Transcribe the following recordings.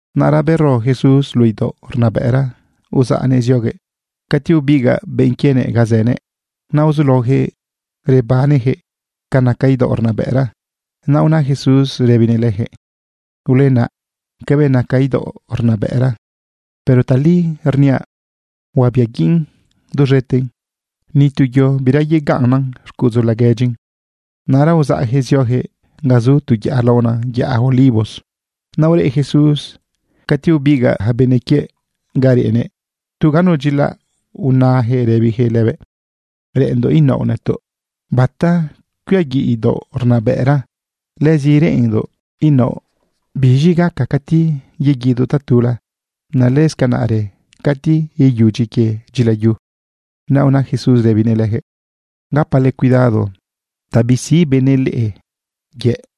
Naꞌra bero Jesús luꞌu idaoꞌ rnabëꞌra, uzaꞌnëꞌ zioguëꞌ cati bebigaꞌ benꞌ quienëꞌ ga zënëꞌ. Naꞌ uzulaojëꞌ rebanejëꞌ ca naca idaoꞌ rnabëꞌra. Naꞌ una Jesús rëbinëꞌ lëjëꞌ: ―Ulenaꞌ cabëꞌ naca idaoꞌ rnabëꞌra. Pero tali rniaꞌ, huabiaguiꞌn duz̃eten, ni tu yo bira yegaꞌnnan xcuꞌudzu laguedyin. Naꞌra uzaꞌjëꞌ ziojëꞌ ga zu tu yaꞌa laona yaꞌa Olivos. Naꞌ ureꞌ Jesús cati bebigaꞌ ja benꞌ quiëꞌ ga reꞌnëꞌ tu ganu dyilaꞌ, unajëꞌ rëbijëꞌ lëbëꞌ: ―Reꞌenndoꞌ inaoꞌ nëtoꞌ bata cuiaguiꞌ idaoꞌ rnabëꞌra. Lëzi reꞌenndoꞌ inaoꞌ biz̃i gaca cati yeguidoꞌ tatula, naꞌ lëscanaꞌrë cati iyudyi quie dyilayu. Naꞌ una Jesús rëbinëꞌ lëjëꞌ: ―Gapale cuidado ta bisiꞌ benëꞌ leꞌe yëꞌ.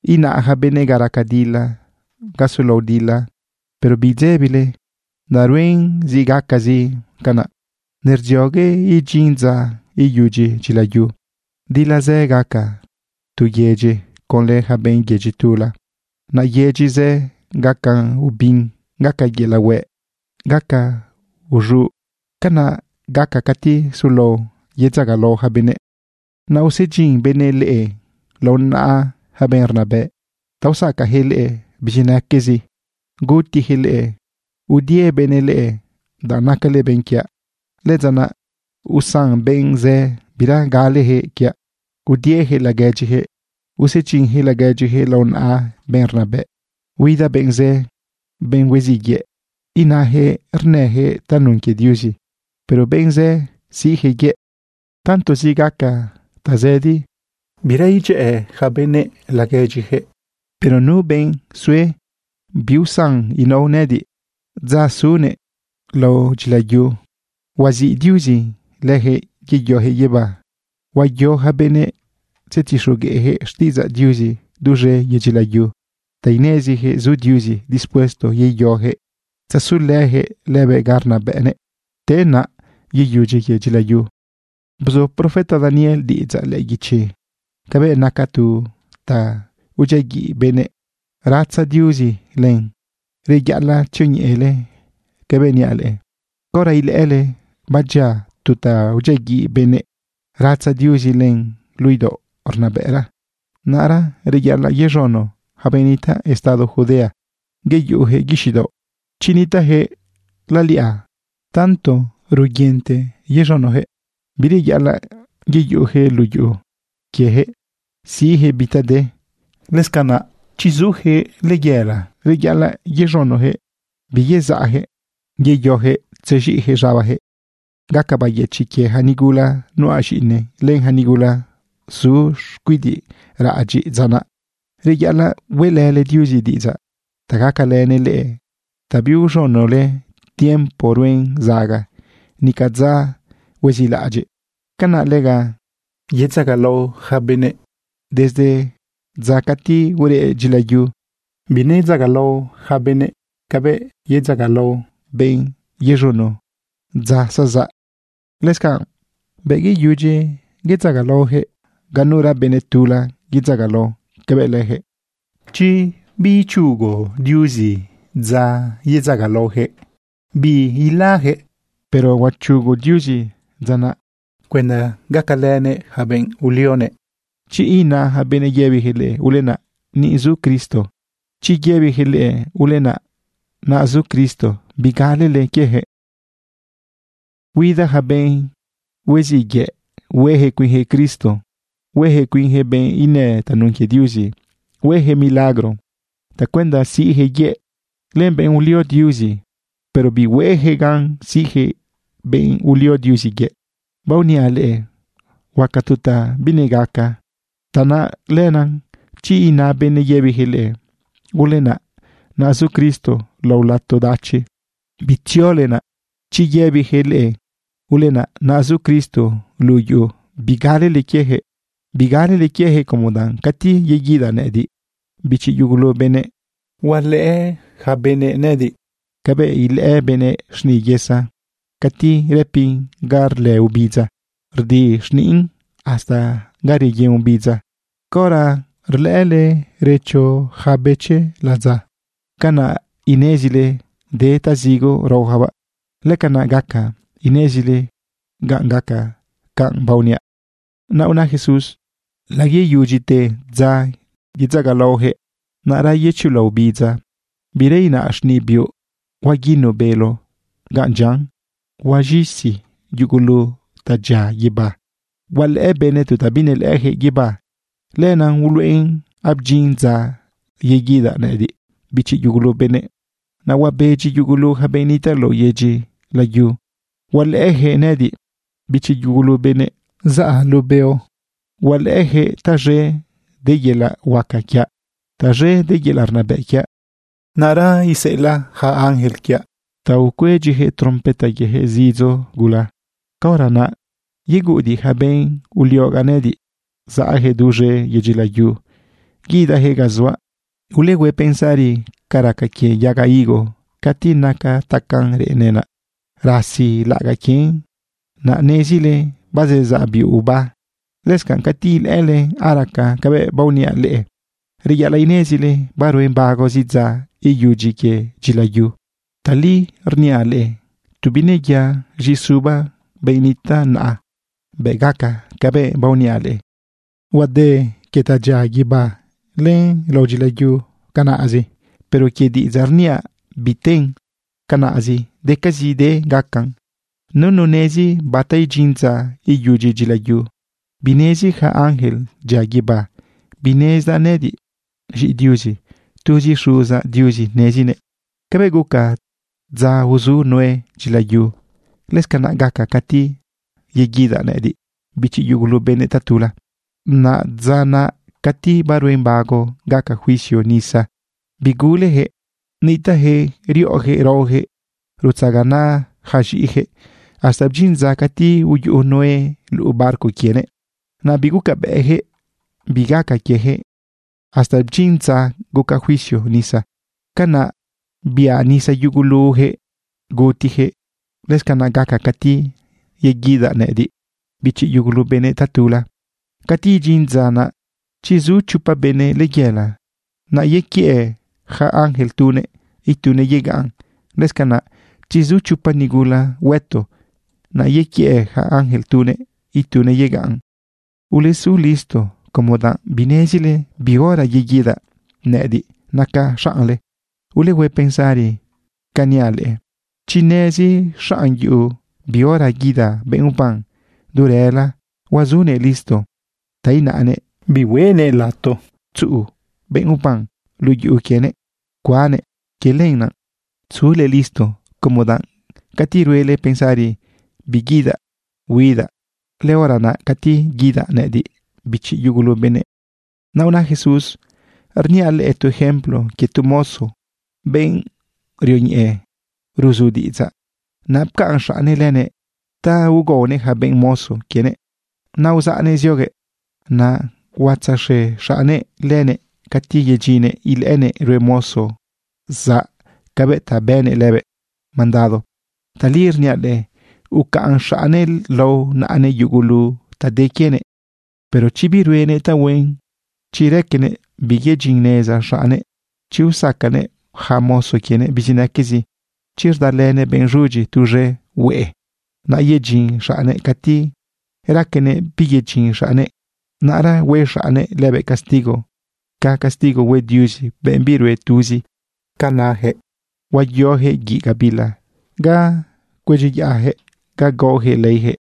Ina ja benëꞌ ga raca dila, ga sulao dila, pero bidzebile, danꞌ ruen zi gacacazi canaꞌ. Nerdziogue idyin dza iyudyi dyilayu. Dila zë gaca tu yedyi conlë ja benꞌ yedyi tula. Naꞌ yedyi zë gaca ubin, gaca yelaꞌ hueꞌ, gaca uz̃uꞌ. Canaꞌ gaca cati sulao yedzagalao ja benëꞌ. ’Naꞌ usedyin benëꞌ leꞌe lao naꞌa ja benꞌ rnabëꞌ ta usacajëꞌ leꞌe bizinaquezi, gutijëꞌ leꞌe. Udie benëꞌ leꞌe danꞌ nacale benꞌ quiaꞌ. Lëdza naꞌ usan benꞌ zë bira galejëꞌ quiaꞌ. Udiejëꞌ laguedyijëꞌ, usedyinjëꞌ laguedyijëꞌ lao naꞌa benꞌ rnabëꞌ. Huida benꞌ zë, benꞌ hueziꞌ yëꞌ, inajëꞌ rnëjëꞌ tanun quie Diuzi, pero benꞌ zë siꞌjëꞌ yëꞌ. Tantozi gaca tazëdi, bira idyëꞌë yaca benëꞌ laguedyijëꞌ. Pero nu benꞌ sue biusan inao nëꞌëdiꞌ dza zunëꞌ lao dyilayu, huaziꞌ Diuzi lëjëꞌ yeyojëꞌ guibá. Huayo ja benëꞌ tzetixogueꞌjëꞌ xtiꞌidzaꞌ Diuzi duz̃e yedyi layu ta inezijëꞌ zu Diuzi dispuesto yeyojëꞌ tzasulëjëꞌ lëbëꞌ ga rnabëꞌnëꞌ. Te naꞌ, yeyudyi quie dyilayu. ’Bzu profeta Daniel diꞌidzaꞌ lëꞌë guichi cabëꞌ naca tu ta udyiaguiꞌ benëꞌ, ratza Diuzi len. Reyaꞌalaꞌ tzioñeꞌele cabëꞌ niaꞌ leꞌe. Caora ilëꞌële badyia tu ta udyiaguiꞌ benëꞌ, ratza Diuzi len luꞌu idaoꞌ rnabëꞌra, naꞌra reyaꞌalaꞌ yez̃uno ja benꞌ nitaꞌ estado Judea yeyojëꞌ guixiꞌ daoꞌ. Chi nitaꞌjëꞌ laliꞌa, tanto ruguinte yez̃unojëꞌ, bireyaꞌalaꞌ yeyuꞌujëꞌ luꞌu yuꞌu quiejëꞌ siꞌjëꞌ bi ta de. Lëscanaꞌ chi zujëꞌ layela, reyaꞌalaꞌ yez̃unojëꞌ biyezaꞌjëꞌ yeyojëꞌ tzez̃iꞌjëꞌ z̃abajëꞌ. Gaca bayëchiꞌ quie ja nigula nuꞌa z̃iꞌine len ja nigula zu xcuidiꞌ raꞌadyiꞌ dza naꞌ. Reyaꞌalaꞌ hueꞌlële Diuzi diꞌidzaꞌ ta gacalënëꞌ leꞌe ta biuz̃unole tiempo ruen zaga, nica dza huezilaꞌadyiꞌ. Canaꞌ lega yedzagalao yaca benëꞌ. Desde dza cati ureꞌ dyilayu, binedzagalao yaca benëꞌ cabëꞌ yedzagalao benꞌ yez̃uno dza zezaꞌ. Lëscanꞌ, bëꞌ yeyudyi bedzagalaojëꞌ, ganura benꞌ tula yedzagalao cabëꞌ lëjëꞌ. Chi biichugu Diuzi dza yedzagalaojëꞌ, biilajëꞌ. Pero huachugu Diuzi dza naꞌ cuenda gacalënëꞌ yaca benꞌ ulionëꞌ. ’Chi ina ja benëꞌ yëbijëꞌ leꞌe: “Ulenaꞌ, ni zu Cristo”, chi yëbijëꞌ leꞌe: “Ulenaꞌ, naꞌ zu Cristo”, bigalele quiejëꞌ. Huida ja benꞌ huiziꞌ yëꞌ huejëꞌ cuinjëꞌ Cristo, huejëꞌ cuinjëꞌ benꞌ inë tanun quie Diuzi. Huejëꞌ milagro tacuenda siꞌjëꞌ yëꞌ len benꞌ ulio Diuzi, pero bihuejëꞌ gan siꞌjëꞌ benꞌ ulio Diuzi yëꞌ. Baoniaꞌ leꞌe huaca tu ta binegaca. Tanaꞌ lenaꞌ chi ina benëꞌ yëbijëꞌ leꞌe: “Ulenaꞌ, naꞌ zu Cristo lao lato dachi”, bitziole naꞌ. Chi yëbijëꞌ leꞌe: “Ulenaꞌ, naꞌ zu Cristo luꞌu yuꞌu”, bigalele quiejëꞌ. Bigalele quiejëꞌ como danꞌ cati yeguidaꞌ nëꞌëdiꞌ, bichi yugulu benëꞌ, hualëꞌë yaca benëꞌ nëꞌëdiꞌ cabëꞌ ilëꞌë benëꞌ xniꞌ yesa cati rëpin ga rlë obidza rdi xniꞌn hasta ga reyen obidza. Caora rlëꞌële recho ja bëchi ladza, canaꞌ inezile de tazigo raojabaꞌ. Lëcanaꞌ gaca inezile ganꞌ gaca canꞌ baoniaꞌ. Naꞌ una Jesús: ―Layeyudyite dza yedzagalaojëꞌ, naꞌra yechula obidza, bira inaꞌ xniꞌ biuꞌ, huaguinu bélo gan dyian, huaz̃isi yugulu ta dyia guibá. Hualëꞌë benëꞌ tu ta binelëꞌëjëꞌ guibá. Lenaꞌ uluꞌen abdyin dza yeguidaꞌ nëꞌëdiꞌ, bichi yugulu benëꞌ. Naꞌ huabedyi yugulu ja benꞌ nitaꞌ lao yedyi layu, hualëꞌëjëꞌ nëꞌëdiꞌ, bichi yugulu benëꞌ, zaꞌa luꞌu beo. Hualëꞌëjëꞌ taz̃e de yelaꞌ huaca quiaꞌ, taz̃e de yelaꞌ rnabëꞌ quiaꞌ. Naꞌra iseꞌelaꞌ yaca ángel quiaꞌ ta cuedyijëꞌ trompeta quiejëꞌ zidzo gula. Caora naꞌ yeguꞌudiꞌ ja benꞌ uliogaꞌ nëꞌëdiꞌ saꞌjëꞌ duz̃e yedyi layu guidajëꞌ ga zuaꞌ. ’Ulehue pensari ca raca quie yaga higo. Cati naca tacaꞌn reꞌene, naꞌ rasi laꞌagaꞌ quien, naꞌ nezile bazezaꞌ biuꞌ uba. Lëscanꞌ cati ilëꞌële araca cabëꞌ baoniaꞌ leꞌe, reyaꞌalaꞌ inezile baruen bagozi dza iyudyi quie dyilayu. Tali rniaꞌ leꞌe, tu bineya z̃iꞌi suba benꞌ nitaꞌ naꞌa, bëꞌ gaca cabëꞌ baoniaꞌ leꞌe. Huade quie ta dyia guibá len lao dyila yu canaꞌzi, pero quie diꞌidzaꞌ rniaꞌ, biten canaꞌzi. Decazide gacan. ’Nunu nezi bata idyin dza iyudyi dyilayu. Binezi ja ángel dyia guibá, binezdaꞌ nëꞌëdiꞌ z̃iꞌi Diuzi. Tuzi Xuzaꞌ Diuzi nezinëꞌ. ’Cabëꞌ guca dza uzu Noé dyilayu, lëscanaꞌ gaca cati yeguidaꞌ nëꞌëdiꞌ, bichi yugulu benëꞌ, tatula. Naꞌ dza naꞌ cati baruen bago gaca juicio nisa, bigulejëꞌ. Nitaꞌjëꞌ riꞌo raojëꞌ, rutzaganaꞌ ja z̃iꞌijëꞌ hasta bdyin dza cati uyuꞌu Noé luꞌu barco quienëꞌ. Naꞌ bigucabëꞌjëꞌ bi gaca quiejëꞌ hasta dyin dza guca juicio nisa, canaꞌ biꞌa nisa yugulujëꞌ gutijëꞌ. Lëscanaꞌ gaca cati yeguidaꞌ nëꞌëdiꞌ, bichi yugulu benëꞌ, tatula. Cati idyin dza naꞌ, chi zu chopa benëꞌ layela, naꞌ yequiëꞌ ja ángel tunëꞌ, itunëꞌ yegaꞌn. Lëscanaꞌ chi zu chopa nigula hueto, naꞌ yequiëꞌ ja ángel tunëꞌ, itunëꞌ yegaꞌn. ’Ulesu listo como danꞌ binezile bi hora yeguidaꞌ nëꞌëdiꞌ nacaꞌ xaꞌnle. Ulehue pensari canꞌ niaꞌ leꞌe. Chi nezi xaꞌn yuꞌu bi hora guida benꞌ uban du rëla, huazunëꞌ listo ta inaꞌnëꞌ bihuenëꞌ lato tzuꞌu benꞌ uban luꞌu yuꞌu quienëꞌ cuannëꞌ. Quie lenaꞌ, sule listo, como danꞌ cati ruele pensari biguidaꞌ, huidaꞌ, lëhora naꞌ cati guidaꞌ nëꞌëdiꞌ, bichi yugulu benëꞌ. Naꞌ una Jesús: ―Rniaꞌ leꞌe tu ejemplo quie tu mozo, benꞌ rioñeꞌe ruzu diꞌidzaꞌ. Naꞌ pcaꞌn xaꞌnnëꞌ lënëꞌ ta ugaonëꞌ ja benꞌ mozo quienëꞌ. Naꞌ uzaꞌnëꞌ zioguëꞌ. Naꞌ huatzaxe xaꞌnnëꞌ lënëꞌ cati yedyinnëꞌ ilëꞌënëꞌ rue mozo zaꞌ cabëꞌ ta bënëꞌ lëbëꞌ mandado. Tali rniaꞌ leꞌe, ucaꞌn xaꞌnnëꞌ lao naꞌanëꞌ yugulu ta de quienëꞌ. Pero chi biruenëꞌ tahuen, chi raquenëꞌ biyedyinneza xaꞌnnëꞌ, chi usacanëꞌ ja mozo quienëꞌ bizinaquezi, chi rdalënëꞌ benꞌ z̃udyi tuz̃e hueꞌe, naꞌ yedyin xaꞌnnëꞌ cati raquenëꞌ biyedyin xaꞌnnëꞌ, naꞌra hue xaꞌnnëꞌ lëbëꞌ castigo ca castigo hue Diuzi benꞌ birue tuzi ca nayaquëꞌ. Huayojëꞌ guiꞌ gabila ga cuedyiyaꞌjëꞌ, ga gaojëꞌ leijëꞌ.